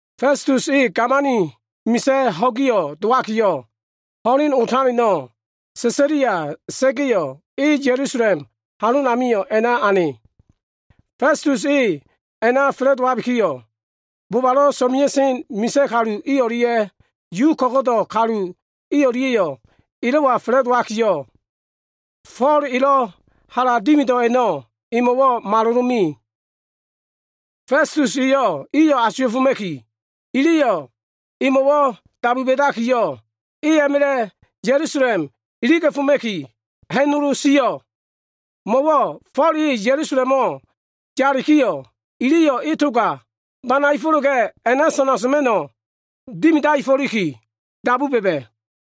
Festus e gamani misa꞉ ho꞉gi dowakiyo꞉, ho꞉len otaleno꞉ Sesalia sa꞉ga꞉yo꞉, e Ya꞉lusalem halonamio꞉ a꞉na ane. Festus e a꞉na fa꞉la꞉dowabikiyo꞉, bobalo꞉ so꞉mea꞉sen misa꞉ kalu i o꞉lia꞉ Yu ko꞉go꞉do꞉ kalu i o꞉lia꞉yo꞉ elo꞉wa fa꞉la꞉dowakiyo꞉, Fo꞉l elo꞉ hala dimido꞉ a꞉no꞉ emo꞉wo꞉ malolome. Festus eyo꞉ iyo꞉ asuwa꞉foma꞉ki, iliyo꞉ emo꞉wo꞉ dabu ba꞉dakiyo꞉, Fo꞉l e a꞉ma꞉la꞉ Ya꞉lusalem iliga꞉foma꞉ki, ha꞉nolo sio꞉. Mo꞉wo꞉ Fo꞉l e Ya꞉lusalemo꞉ yalikiyo꞉, iliyo꞉ e toga banaefo꞉la꞉ga꞉ a꞉na sana soma꞉no꞉ dimidaefo꞉liki, dabu ba꞉ba꞉.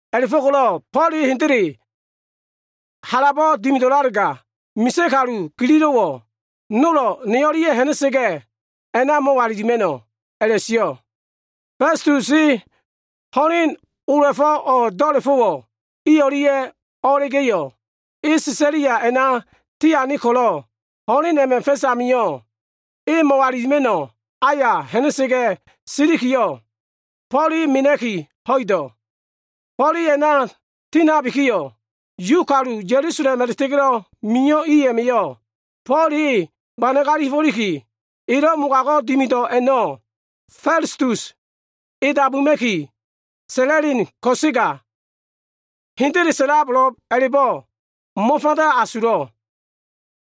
A꞉la꞉fo꞉ko꞉lo꞉ Fo꞉l e hendele halabo꞉ dimido꞉lalega, misa꞉ kalu gililo꞉wo꞉ nolo꞉ ne o꞉lia꞉ ha꞉na꞉sa꞉ga꞉, a꞉na mo꞉walilima꞉no꞉” a꞉la꞉sio꞉. Festus e ho꞉len ola꞉fo꞉ o꞉ do꞉la꞉fo꞉wo꞉ i o꞉lia꞉ o꞉la꞉ga꞉yo꞉, e Sesalia a꞉na tiane ko꞉lo꞉, ho꞉len a꞉ma꞉ fa꞉s amio꞉, e mo꞉walilima꞉no꞉ aya ha꞉na꞉ga꞉ silikiyo꞉, Fo꞉l e mena꞉ki ho꞉ido꞉. Fo꞉l e a꞉na tindabikiyo꞉, Yu kalu Ya꞉lusalem a꞉la꞉ta꞉ga꞉lo꞉ mio꞉ i a꞉ma꞉yo꞉, Fo꞉l e banagalia꞉fo꞉liki, elo꞉ mogago꞉ dimido꞉ a꞉no꞉ Festus e dabuma꞉ki sa꞉la꞉len ko꞉sega, hendele sa꞉lab a꞉la꞉bo꞉ mo꞉fanda asulo꞉.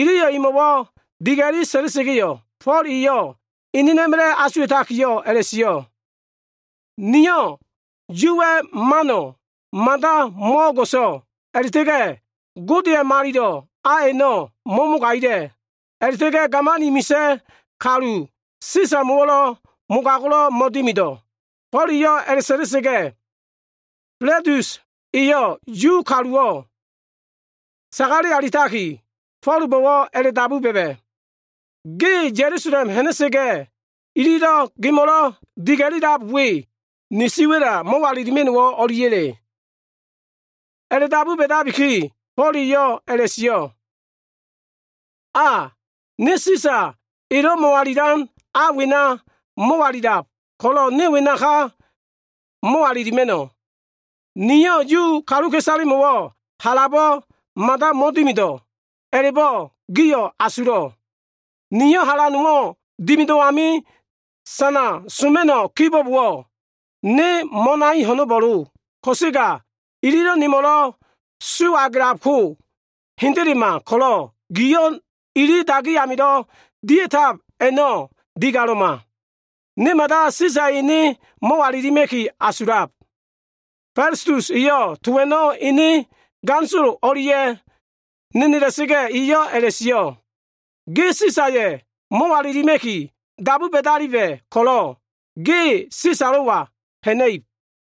Iliyo꞉ emo꞉wo꞉ diga꞉li sa꞉la꞉sa꞉ga꞉yo꞉, Fo꞉l eyo꞉ enena꞉ma꞉la꞉ asuwa꞉takiyo꞉ a꞉la꞉sio꞉, “Niyo꞉ Yuwa꞉ mano꞉ mada mo꞉o꞉go꞉so꞉ a꞉la꞉ta꞉ga꞉, Godeya꞉ malilo꞉ a a꞉no꞉ mo꞉mogagila꞉ a꞉la꞉ta꞉ga꞉ gamani misa꞉ kalu Sisamo꞉wo꞉ mogago꞉wo꞉ mo꞉dimido꞉.” Fo꞉l eyo꞉ a꞉la꞉sa꞉la꞉sa꞉ga꞉, Festus eyo꞉ Yu kaluwo꞉ sagale alitakiyo꞉, Fo꞉lbo꞉wo꞉ a꞉la꞉dabu ba꞉ba꞉, “Ge Ya꞉lusalem ha꞉na꞉sa꞉ga꞉, ililo꞉ gemo꞉lo꞉ diga꞉lilab we, ni siwa꞉la mo꞉walilima꞉no꞉wo꞉ o꞉liya꞉le?” A꞉la꞉dabu ba꞉dabiki, Fo꞉l eyo꞉ a꞉la꞉sio꞉, “A, ne Sisa elo꞉ mo꞉walilan a wena mo꞉walilab ko꞉lo꞉ ne wenaka mo꞉walilima꞉no꞉. Niyo꞉ Yu kaluka꞉isalemo꞉wo꞉ halabo꞉ mada mo꞉dimido꞉ a꞉la꞉bo꞉ giyo꞉ asulo꞉. Niyo꞉ hala nowo꞉ dimido꞉ ami sana soma꞉no꞉ kibo꞉bowo꞉, ne mo꞉nai ho꞉no꞉bo꞉lo. Ko꞉sega ililo꞉ nemo꞉lo꞉ su agelabko hendelema ko꞉lo꞉, giyo꞉ ili dagi amilo꞉ dia꞉tab a꞉no꞉ digalo꞉ma. Ne mada Sisaya꞉ ene mo꞉walilima꞉ki asulab.” Festus eyo꞉ to a꞉no꞉ ene ganisolo o꞉lia꞉ nenela꞉sa꞉ga꞉, eyo꞉ a꞉la꞉sio꞉, “Ge Sisaya꞉ mo꞉walilima꞉ki dabu ba꞉daliba꞉ ko꞉lo꞉ ge Sisalo꞉wa ha꞉na꞉ib.”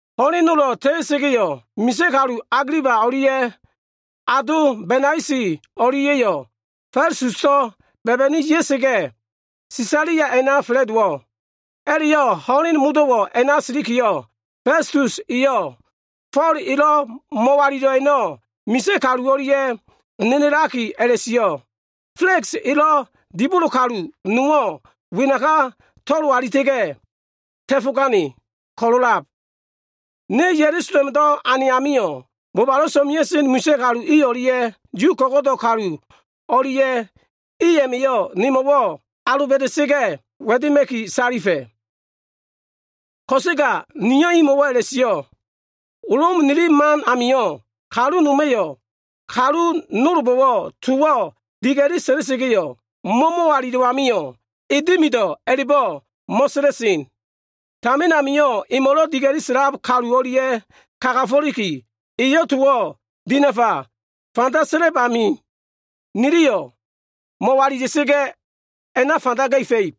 Ho꞉len nolo꞉ ta꞉ta꞉sa꞉ga꞉yo꞉, misa꞉ kalu Agiliba o꞉lia꞉ ado Benaisi o꞉lia꞉yo꞉ Festuso꞉ ba꞉ba꞉ni ya꞉sa꞉ga꞉, Sesalia a꞉na fa꞉la꞉dowo꞉. A꞉la꞉yo꞉ ho꞉len modo꞉wo꞉ a꞉na silikiyo꞉, Festus eyo꞉ Fo꞉l elo꞉ mo꞉walilo꞉ a꞉no꞉ misa꞉ kalu o꞉lia꞉ nenelakiyo꞉ a꞉la꞉sio꞉, “Fela꞉ks elo꞉ dibolo kalu nowo꞉ wenaka to꞉lo alita꞉ga꞉ ta꞉fo꞉gane ko꞉lo꞉lab. Ne Ya꞉lusalemdo꞉ ane amio꞉, bobalo꞉ so꞉mea꞉sen misa꞉ kalu i o꞉lia꞉ Yu ko꞉go꞉do꞉ kalu i o꞉lia꞉ma꞉yo꞉ ne mo꞉walila꞉sa꞉ga꞉ wa꞉dema꞉ki salifa꞉. Ko꞉sega niyo꞉ imo꞉wo꞉ a꞉la꞉sio꞉, ‘Lom nili man amio꞉, kalu noma꞉yo꞉ kalu nolbo꞉wo꞉ towo꞉ diga꞉li sa꞉la꞉sa꞉ga꞉, mo꞉ mo꞉walilo꞉ amio꞉, “e dimido꞉” a꞉la꞉bo꞉ mo꞉sa꞉la꞉sen. Tamin amio꞉ emo꞉lo꞉ diga꞉li sa꞉lab kalu o꞉lia꞉ kagafo꞉likiyo꞉, eyo꞉ towo꞉ dinafa fanda sa꞉lab amio꞉, niliyo꞉ mo꞉walila꞉sa꞉ga꞉, a꞉na fanda ga꞉fa꞉ib.’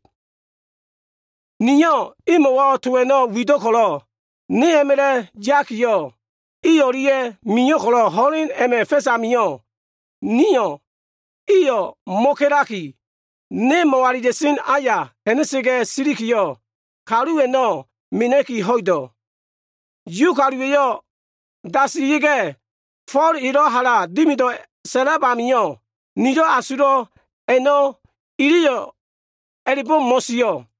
Niyo꞉ imo꞉wo꞉ to a꞉no꞉ wido꞉ ko꞉lo꞉ ne a꞉ma꞉la꞉ yakiyo꞉, i o꞉lia꞉ mio꞉ ko꞉lo꞉, ho꞉len a꞉ma꞉ fa꞉s amio꞉ niyo꞉ iyo꞉ mo꞉ka꞉laki, ne mo꞉walila꞉sen aya ha꞉na꞉ga꞉ silikiyo꞉, kalu a꞉no꞉ mena꞉ki ho꞉ido꞉. Yu kaluwa꞉yo꞉ dasila꞉sa꞉ga꞉ Fo꞉l elo꞉ hala dimido꞉ sa꞉lab amio꞉, nilo꞉ asulo꞉ a꞉no꞉ iliyo꞉ a꞉la꞉bo꞉ mo꞉sio꞉.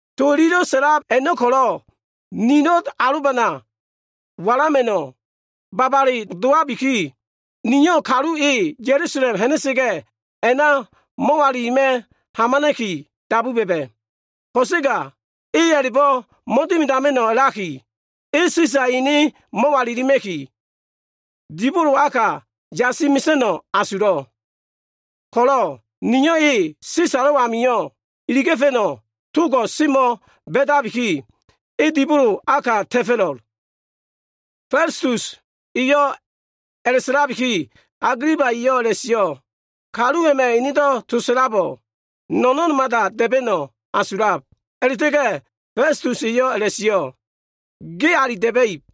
To ililo꞉ sa꞉lab a꞉no꞉ ko꞉lo꞉ nilo꞉ alobana walama꞉no꞉wo꞉ babale dowabiki, niyo꞉ kalu e Ya꞉lusalem ha꞉na꞉sa꞉ga꞉ a꞉na mo꞉walilima꞉ hamana꞉ki dabu ba꞉ba꞉. Ko꞉sega e a꞉la꞉bo꞉ mo꞉dimidama꞉no꞉ a꞉laki, e Sisaya꞉ ene mo꞉walilima꞉ki, dibolo aka yasi mesa꞉no꞉ asulo꞉ ko꞉lo꞉ niyo꞉ e Sisalo꞉ amio꞉ iliga꞉fa꞉no꞉ togo꞉ semo꞉ ba꞉dabiki, e dibolo ka ta꞉fo꞉lo꞉l.” Festus eyo꞉ a꞉la꞉sa꞉labiki, Agiliba eyo꞉ a꞉la꞉sio꞉, “Kalu a꞉ma꞉ enedo꞉ to sa꞉labo꞉, no꞉no꞉n mada da꞉ba꞉no꞉ asulab.” A꞉la꞉ta꞉ga꞉ Festus eyo꞉ a꞉la꞉sio꞉, “Ge ali da꞉ba꞉ib.”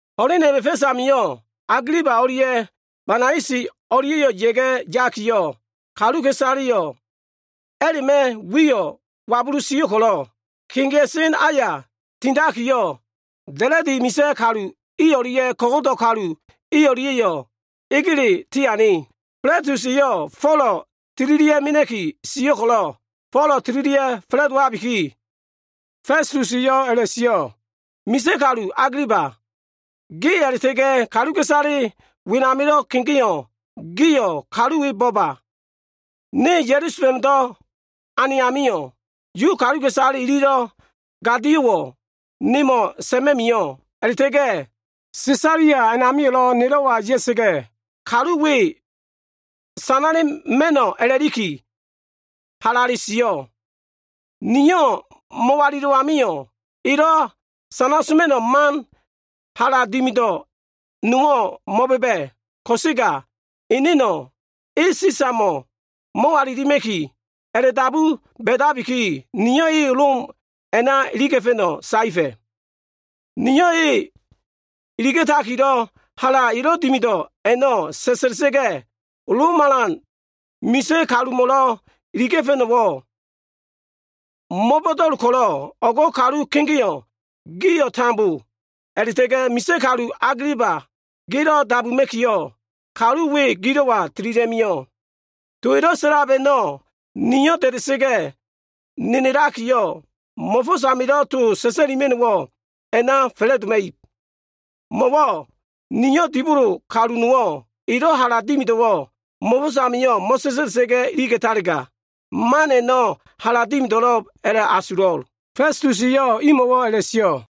Ho꞉len a꞉ma꞉ fa꞉s amio꞉ Agiliba o꞉lia꞉ Benaisi o꞉lia꞉yo꞉ ya꞉ga꞉ yakiyo꞉, kaluka꞉isaleyo꞉ a꞉la꞉ma꞉ wiyo꞉ wabulu sio꞉ ko꞉lo꞉, kegea꞉sen aya tinakiyo꞉, da꞉la꞉di misa꞉ kalu i o꞉lia꞉ ko꞉go꞉do꞉ kalu o꞉lia꞉yo꞉ egele tiane. Festus eyo꞉ Fo꞉lo꞉ tililia꞉ mena꞉ki sio꞉ ko꞉lo꞉, Folo꞉ tililia꞉ fa꞉la꞉dowabikiyo꞉, Festus eyo꞉ a꞉la꞉sio꞉, “Misa꞉ kalu Agiliba, ge a꞉la꞉ta꞉ga꞉ kaluka꞉isale wenamilo꞉ kegeo꞉ gio꞉ kalu we bo꞉ba. Ne Ya꞉lusalemdo꞉ ane amio꞉, Yu kaluka꞉isale ililo꞉ gadio꞉wo꞉ nemo꞉ sa꞉ma꞉ mio꞉ a꞉la꞉ta꞉ga꞉ Sesalia a꞉namio꞉lo꞉ nelo꞉wa ya꞉sa꞉ga꞉, kalu we sanala꞉ma꞉no꞉ a꞉la꞉likiyo꞉ halale sio꞉. Niyo꞉ mo꞉walilo꞉ amio꞉, elo꞉ sanala꞉ma꞉no꞉ man hala dimido꞉ nowo꞉ mo꞉ba꞉ba꞉ ko꞉sega, eneno꞉ e Sisamo꞉ mo꞉walilima꞉ki a꞉la꞉dabu ba꞉dabiki, niyo꞉ e Lom a꞉na iliga꞉fa꞉no꞉ saefa꞉. Niyo꞉ e iliga꞉takilo꞉ hala elo꞉ dimido꞉ a꞉no꞉ sa꞉sa꞉lilia꞉ga꞉, Lom alan misa꞉ kalumo꞉lo꞉ iliga꞉fa꞉no꞉wo꞉ mo꞉bo꞉do꞉l ko꞉lo꞉ o꞉gdo꞉ kalu kegeo꞉ gio꞉ tambo a꞉la꞉ta꞉ga꞉ misa꞉ kalu Agiliba gelo꞉ dabuma꞉kiyo꞉, kalu we gilo꞉wa tililia꞉ mio꞉. To elo꞉ sa꞉lab a꞉no꞉ nio꞉ da꞉da꞉sa꞉ga꞉ nenelakiyo꞉, mo꞉fo꞉s amilo꞉ to sa꞉sa꞉lima꞉no꞉wo꞉ a꞉na fa꞉la꞉doma꞉ib. Mo꞉wo꞉ niyo꞉ dibolo kalu nowo꞉ elo꞉ hala dimido꞉wo꞉ mo꞉fo꞉s amio꞉ mo꞉sa꞉sa꞉la꞉sa꞉ga꞉ iliga꞉talega, man a꞉no꞉ hala dimidama꞉no꞉lo꞉b a꞉la꞉asulo꞉l.” Festus eyo꞉ imo꞉wo꞉ a꞉la꞉sio꞉.